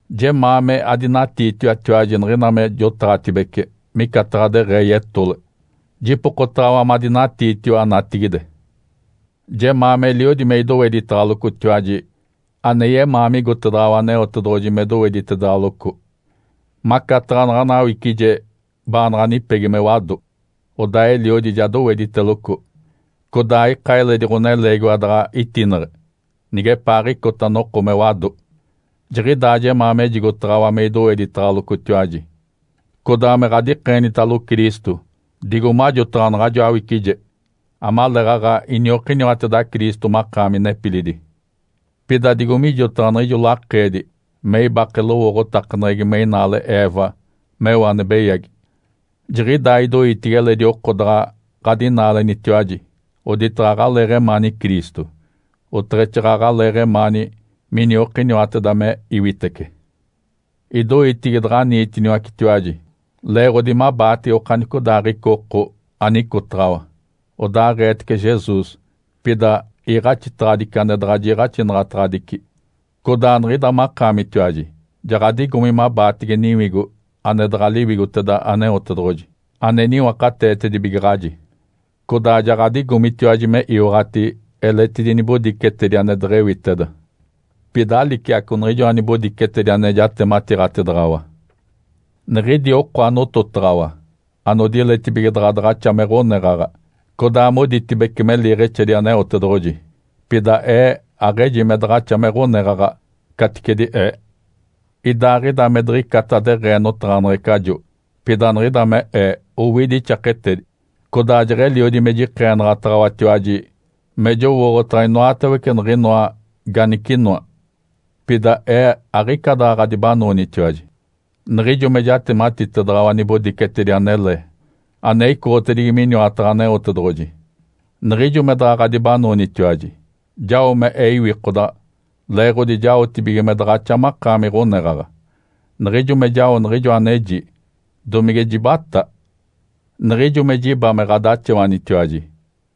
Jemaa me adinatiitiwatiwaji niɡ̶ina me jotaɡ̶atibece micataɡ̶a deɡ̶ee yetole. Jipokotaɡ̶awa madinatiitiwa natigide! Jemaa meliodi me idoweditaɡ̶alocotiwaji ane yemaa migotedaɡ̶awa Aneotedoɡ̶oji me doweditedaɡ̶aloco. Macataɡ̶a naɡ̶ana awicije baanaɡ̶a nipegi me wado, odaa eliodi ja dowediteloco, codaa aika eledi ɡ̶oneleegiwa daɡ̶a itineɡ̶e, nigepaaɡ̶icota noko me wado. Jiɡ̶idaa jemaa mejigotaɡ̶awa me idoweditaɡ̶alocotiwaji, codaa me ɡ̶adikeenitalo Cristo, digo majotaɡ̶a naɡ̶ajo awicije, amaleeɡ̶aɡ̶a iniokiniwateda Cristo makaami nepilidi. Pida digo mijotaɡ̶a niɡ̶ijo Lakeedi me ibake lowooɡ̶otakaneɡ̶egi me inaale Eva meo ane beyagi. Jiɡ̶idaa idoitigi eledi oko daɡ̶a ɡ̶adinaalenitiwaji oditaɡ̶a aɡ̶aleeɡ̶emaani Cristo, oteɡ̶exaaɡ̶aɡ̶aleeɡ̶emaani miniokiniwateda me iwitece. Idoitigi daɡ̶aniitiniwacetiwaji, leeɡ̶odi mabaatege okanicodaaɡ̶ica oko anicotaɡ̶awa, odaaɡ̶eetece Jesus, pida iiɡ̶axitaɡ̶adici ane daɡ̶a jiiɡ̶axinaɡ̶ataɡ̶adici. Codaa niɡ̶ida makaamitiwaji ja ɡ̶adigomi mabaatege niwigo ane daɡ̶a Liwigoteda Aneotedoɡ̶oji, ane niwakateetibigaɡ̶aji. Codaa ja ɡ̶adigomitiwaji me iwaɡ̶ati eletidi nibodicetedi ane deɡ̶ewiteda, pida aliciaco niɡ̶ijoa nibodicetedi ane jatematiiɡ̶atedaɡ̶awa. Niɡ̶idi oko anototaɡ̶awa, anodiletibige daɡ̶a daɡ̶axa me ɡ̶oneɡ̶aɡ̶a codaa moditibece me liiɡ̶exedi Aneotedoɡ̶oji, pida ee aɡ̶eji me daɡ̶axa me ɡ̶oneɡ̶aɡ̶a caticedi ee. Idaaɡ̶ida me diɡ̶icata deɡ̶ee notaɡ̶aneɡ̶ecajo, pida niɡ̶ida me ee owidi ixaketedi. Codaa jeɡ̶eliodi me jikeenaɡ̶ataɡ̶awatiwaji me jowooɡ̶otaɡ̶a inoatawece niɡ̶inoa ganicinoa. Pida ee aɡ̶ica daɡ̶a ɡ̶adibanoonitiwaji niɡ̶ijo me jatematitedaɡ̶awa nibodicetedi anele ane icoɡ̶otedigi miniwataɡ̶a Aneotedoɡ̶oji. Niɡ̶ijo me daɡ̶a ɡ̶adibanoonitiwaji, jao me ee iwikodaɡ̶a leeɡ̶odi jaotibige me daɡ̶axa makaami ɡ̶oneɡ̶aɡ̶a. Niɡ̶ijo me jao niɡ̶ijo aneji, domige jibatá? Niɡ̶ijo me jiba me ɡ̶adaxawanitiwaji,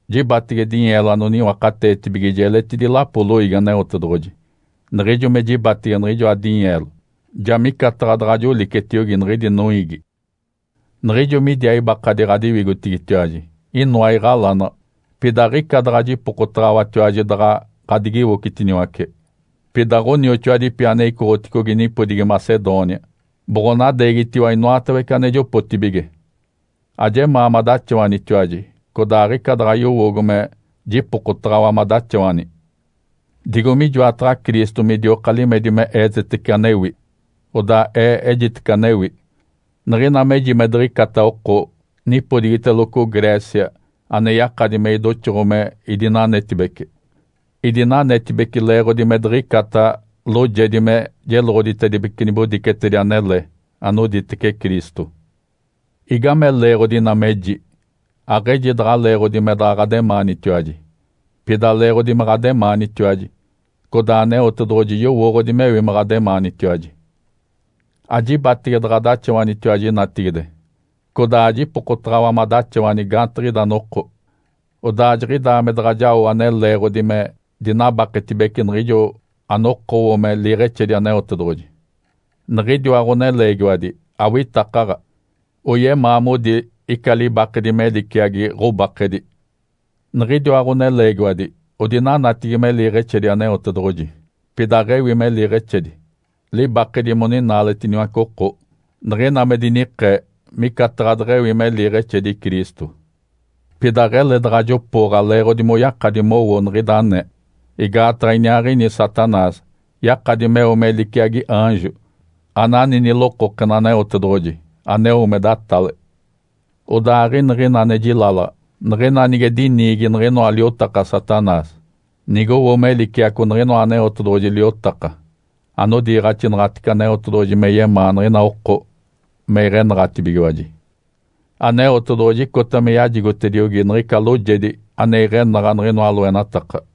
jibatege dinyeelo anoniwakateetibigiji eletidi lapoli loiigi Aneotedoɡ̶oji. Niɡ̶ijo me jibatege niɡ̶ijoa dinyeelo, ja micataɡ̶a daɡ̶a jolicetiogi niɡ̶idi noiigi. Niɡ̶ijo midiaa ibakadi ɡ̶adiwigotigitiwaji inoa iɡ̶alanaɡ̶a, pida aɡ̶ica daɡ̶a jipokotaɡ̶awatiwaji daɡ̶a ɡ̶adigiwocitiniwace. Pida ɡ̶onioxoadipi ane icoɡ̶oticogi nipodigi Macedônia boɡ̶onadeegitiwa inoatawece ane jopotibige. Ajemaa madaxawanitiwaji, codaa aɡ̶ica daɡ̶a yowoogo me jipokotaɡ̶awa madaxawani. Digo mijoataɡ̶a Cristo midioka limedi me eetetece anewi, odaa ee ejitece anewi, niɡ̶ina meji me diɡ̶icata oko nipodigiteloco Grécia ane yakadi me idoxoɡ̶o me idinanetibece. Idinanetibece leeɡ̶odi me diɡ̶icata loojedi me jeloɡ̶oditedibece nibodicetedi anele anoditece Cristo. Igame leeɡ̶odi ina meji? Aɡ̶eji daɡ̶a leeɡ̶odi me daɡ̶a ɡ̶ademaanitatiwaji, pida leeɡ̶odi me ɡ̶ademaanitiwaji, codaa Aneotedoɡ̶oji yowooɡ̶odi mewi me ɡ̶ademaanitiwaji. Ajibatege daɡ̶adaxawanitiwaji natigide, codaa ajipokotaɡ̶awa madaxawani gaantiɡ̶ida noko. Odaa jiɡ̶idaa me daɡ̶a jao ane leeɡ̶odi me dinabaketibece niɡ̶ijo anokowo me liiɡ̶exedi Aneotedoɡ̶oji. Niɡ̶idiwa ɡ̶oneleegiwadi awitakaɡ̶a oyemaa modi ica libakedi me liciagi ɡ̶obakedi. Niɡ̶idiwa ɡ̶oneleegiwadi odinanatigi me liiɡ̶exedi Aneotedoɡ̶oji, pida aɡ̶ewi me liiɡ̶exedi. Libakedi moninaaletiniwace oko. Niɡ̶ina me dinikee micataɡ̶a deɡ̶ewi me liiɡ̶exedi Cristo. Pida aɡ̶ele daɡ̶a jopooɡ̶a leeɡ̶odi moyakadi mowo niɡ̶ida anee. Igaataɡ̶a iniaaɡ̶ini Satanás yakadi meo me liciagi aanjo anani nilokokena Aneotedoɡ̶oji aneo me datale. Odaa aɡ̶iniɡ̶ina ane jilalaɡ̶a niɡ̶ina nige diniigi niɡ̶inoa liotaka Satanás nigowo me liciaco niɡ̶inoa Aneotedoɡ̶oji liotaka, anodiiɡ̶axinaɡ̶atece Aneotedoɡ̶oji me yemaa niɡ̶ina oko me iɡ̶enaɡ̶atibigiwaji. Aneotedoɡ̶oji icota me yajigotediogi niɡ̶ica loojedi ane iɡ̶enaɡ̶a niɡ̶inoa loenataka.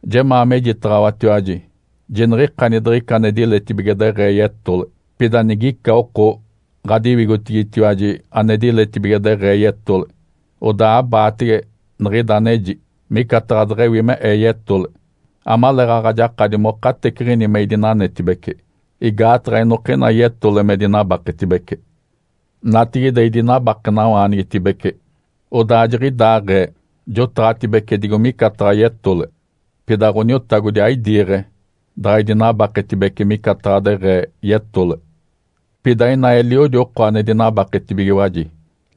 Jemaa mejitacaɡ̶awatiwaji. Jiniɡ̶ikani diɡ̶ica ane diletibige deɡ̶ee yetole. Pida nigica oko ɡ̶adiwigotigitiwaji ane diletibige deɡ̶ee yetole, odaa abaatege niɡ̶ida aneji, micataɡ̶a deɡ̶ewi me ee yetole, amaleeɡ̶aɡ̶a jakadi monateciɡ̶ini me idinanetibece. (Igaataɡ̶a inokina yetole me dinabaketibece.) Natigide idinabakenawaanigitibece, odaa jiɡ̶idaaɡ̶ee jotaɡ̶atibece digo micataɡ̶a yetole. Pida Ǥoniotagodi aidiiɡ̶e daɡ̶a idinabaketibece micataɡ̶a deɡ̶ee yetole. Pida ina eliodi oko ane dinabaketibigiwaji,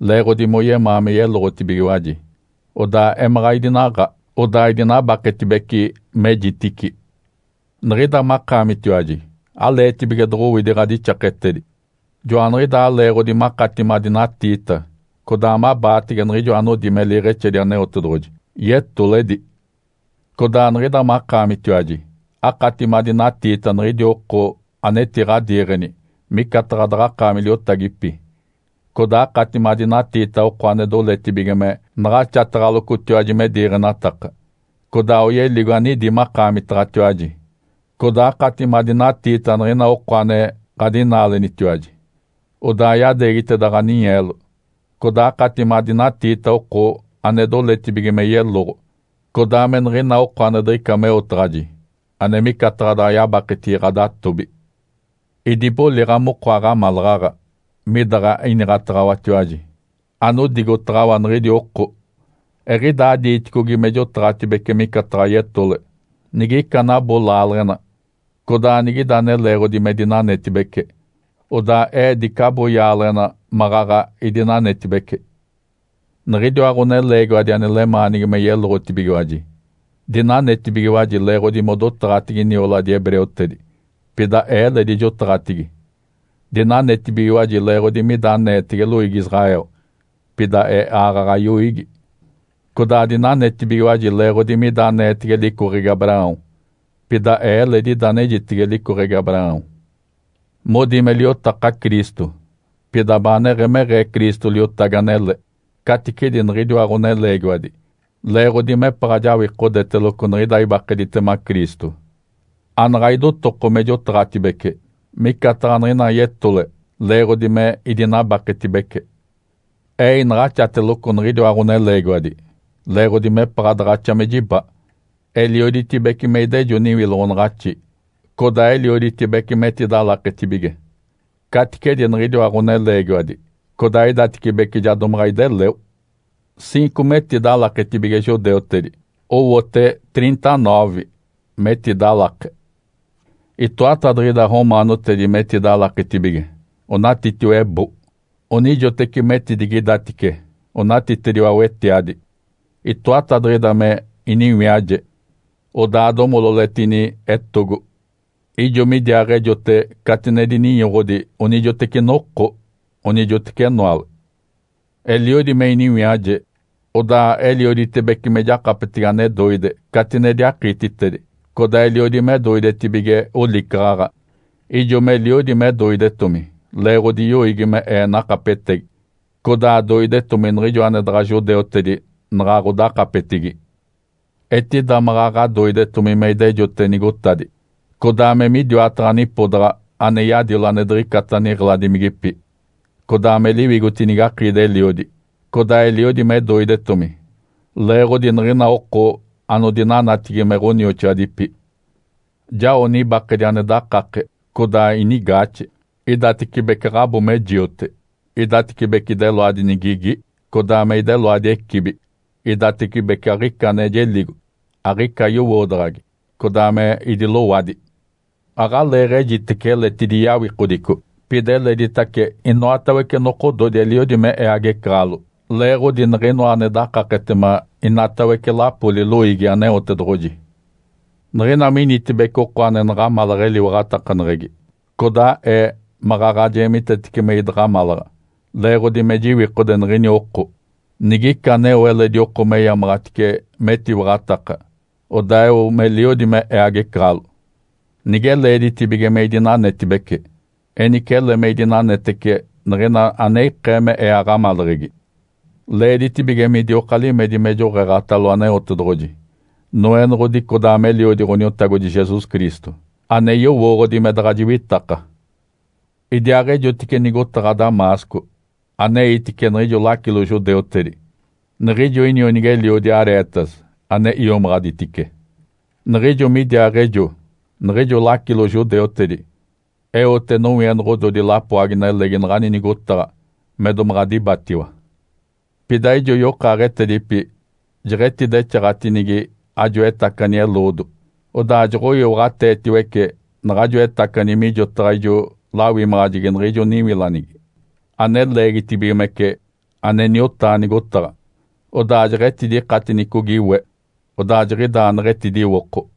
leeɡ̶odi moyemaa me yeloɡ̶otibigiwaji. Odaa emaɡ̶a idinaaɡ̶a, odaa idinabaketibece mejitici. Niɡ̶ida makaamitiwaji aleetibige doɡ̶owidi ɡ̶adixaketedi. Joaniɡ̶idaa leeɡ̶odi makati madinatiita codaa mabaatege niɡ̶ijo anodi me liiɡ̶exedi Aneotedoɡ̶oji, yetoledi. Codaa niɡ̶ida makaamitiwaji akati madinatiita niɡ̶idi oko anetiɡ̶adiiɡ̶eni micataɡ̶a daɡ̶akaami liotagipi, codaa akati madinatiita oko ane doletibige me naɡ̶axataɡ̶alocotiwaji me diiɡ̶enataka, codaa oyeligo anidi makaamitaɡ̶atiwaji, codaa akati madinatiita niɡ̶ina oko ane ɡ̶adinaalenitiwaji odaa yadeegiteda ɡ̶aninyeelo, codaa akati madinatiita oko ane doletibige me yeloɡ̶o, codaa me niɡ̶ina oko ane diɡ̶ica meotaɡ̶aji ane micataɡ̶a daɡ̶a yabaketigi ɡ̶adatobi. Idiboliɡ̶a moko aɡ̶amalaɡ̶aɡ̶a midaɡ̶a iniɡ̶ataɡ̶awatiwaji, anodigotaɡ̶awa niɡ̶idi oko. Eɡ̶idaa diiticogi me jotaɡ̶atibece micataɡ̶a yetole. Nigica anabo laaleɡ̶ena codaa nigida ane leeɡ̶odi me dinanetibece, odaa ee dicabo yaaleɡ̶ena maɡ̶aɡ̶a idinanetibece. Niɡ̶idiwa ɡ̶oneleegiwadi ane lemaanigi me yeloɡ̶otibigiwaji, dinanetibigiwaji leeɡ̶odi modotaɡ̶atigi nioladi hebreutedi. Pida ee eledi jotaɡ̶atigi. Dinanetibigiwaji leeɡ̶odi mida aneetege loiigi Israel, pida ee aaɡ̶aɡ̶a yoiigi. Codaa dinanetibigiwaji leeɡ̶odi mida aneetege licoɡ̶egi Abraão, pida ee eledi ida anejitege licoɡ̶egi Abraão. Modi me liotaka Cristo, pida baaneɡ̶emeɡ̶ee Cristo liotagi anele caticedi niɡ̶idiwa ɡ̶oneleegiwadi, leeɡ̶odi mepaɡ̶a jawikodeteloco niɡ̶ida ibakeditema Cristo. Anaɡ̶a idotoko me jotaɡ̶atibece micataɡ̶a niɡ̶ina yetole leeɡ̶odi me idinabaketibece. Ee inaɡ̶axateloco niɡ̶idiwa ɡ̶oneleegiwadi, leeɡ̶odi mepaɡ̶a daɡ̶axa me jiba. Elioditibece me idejo niwiloɡ̶onaɡ̶axi, codaa elioditibece metidalaketibige, caticedi niɡ̶idiwa ɡ̶oneleegiwadi, codaa idatecibece ja domaɡ̶a ideleo. Ciinco metidalaketibige judeutedi. Owote trinta-noove metidalake. Itoatadiɡ̶ida romaanotedi metidalaketibige onatitiwa ebo. Onijoteci metidigidatice onatitediwa wetiadi. Itoatadiɡ̶ida me iniwiaje, odaa domololetini etogo. Ijo midiaaɡ̶ejote catinedi ninyoɡ̶odi onijoteci noko, onijoteci enoale. Eliodi me iniwiaje, odaa elioditibece me jakapetege ane doide catinedi akiititedi, codaa eliodi me doidetibige olicaɡ̶aɡ̶a, ijo meliodi me doidetomi leeɡ̶odi yoiigi me ee nakapetegi, codaa doidetomi niɡ̶ijo ane daɡ̶a judeutedi naɡ̶aɡ̶odakapetigi. Etida maɡ̶aɡ̶a doidetomi me idejote nigotadi, codaa me midiwataɡ̶a nipodaɡ̶a ane yadilo ane diɡ̶icata niɡ̶eladimigipi, codaa me liwigotinigi akiidi-eliodi. Codaa eliodi me doidetomi, leeɡ̶odi niɡ̶ina oko anodinanatigi me ɡ̶onioxoadipi. Jao nibakedi ane dakake, codaa inigaaxe. Idatecibece aɡ̶abo me jiote. Idatecibece ideloadi nigigi, codaa me ideloadi ecibi. Idatecibece aɡ̶ica ane jeligo, aɡ̶ica yowoodaɡ̶agi, codaa me idilowadi. Aɡ̶aleeɡ̶ejitece eletidi yawikodico. Pida eleditace inoatawece nokododi eliodi me ee agecaɡ̶alo leeɡ̶odi niɡ̶inoa ane dakaketema inoatawece lapoli loiigi Aneotedoɡ̶oji. Niɡ̶ina minitibece oko ane naɡ̶amalaɡ̶a eliwaɡ̶atakaneɡ̶egi, codaa ee maɡ̶aɡ̶a jeemitetece me idaɡ̶amalaɡ̶a, leeɡ̶odi me jiwikode niɡ̶ini oko. Nigica aneo eledi oko meyamaɡ̶atice metiwaɡ̶ataka, odaa eo meliodi me ee agecaɡ̶alo. Nige leeditibige me idinanetibece, enice ele me idinanetece niɡ̶ina ane ikee me ee aɡ̶amaleɡ̶egi. Leeditibige midioka limedi me joɡ̶eeɡ̶atalo Aneotedoɡ̶oji, Noenoɡ̶odi codaa me Eliodi Ǥoniotagodi Jesus Cristo, ane yowooɡ̶odi me daɡ̶a jiwitaka. Idiaaɡ̶ejotice nigotaɡ̶a Damasco aneitice niɡ̶ijo lacilo judeutedi, niɡ̶ijo inionigi-eliodi Aretas ane iomaɡ̶aditice. Niɡ̶ijo midiaaɡ̶ejo, niɡ̶ijo lacilo judeutedi eote nowienoɡ̶ododi lapoagi-nelegi naɡ̶ani nigotaɡ̶a me domaɡ̶a dibatiwa. Pida ijo yokaaɡ̶etedipi jeɡ̶etidexaɡ̶atinigi ajo etacani eloodo. Odaa joɡ̶oiwaɡ̶ateetiwece naɡ̶ajo etacani mijotaɡ̶a ijo lawimaɡ̶ajegi niɡ̶ijo niwilanigi, ane leegitibigimece, ane niotaa nigotaɡ̶a. Odaa jeɡ̶etidikatinicogi we. Odaa jiɡ̶idaa neɡ̶etidiwoko.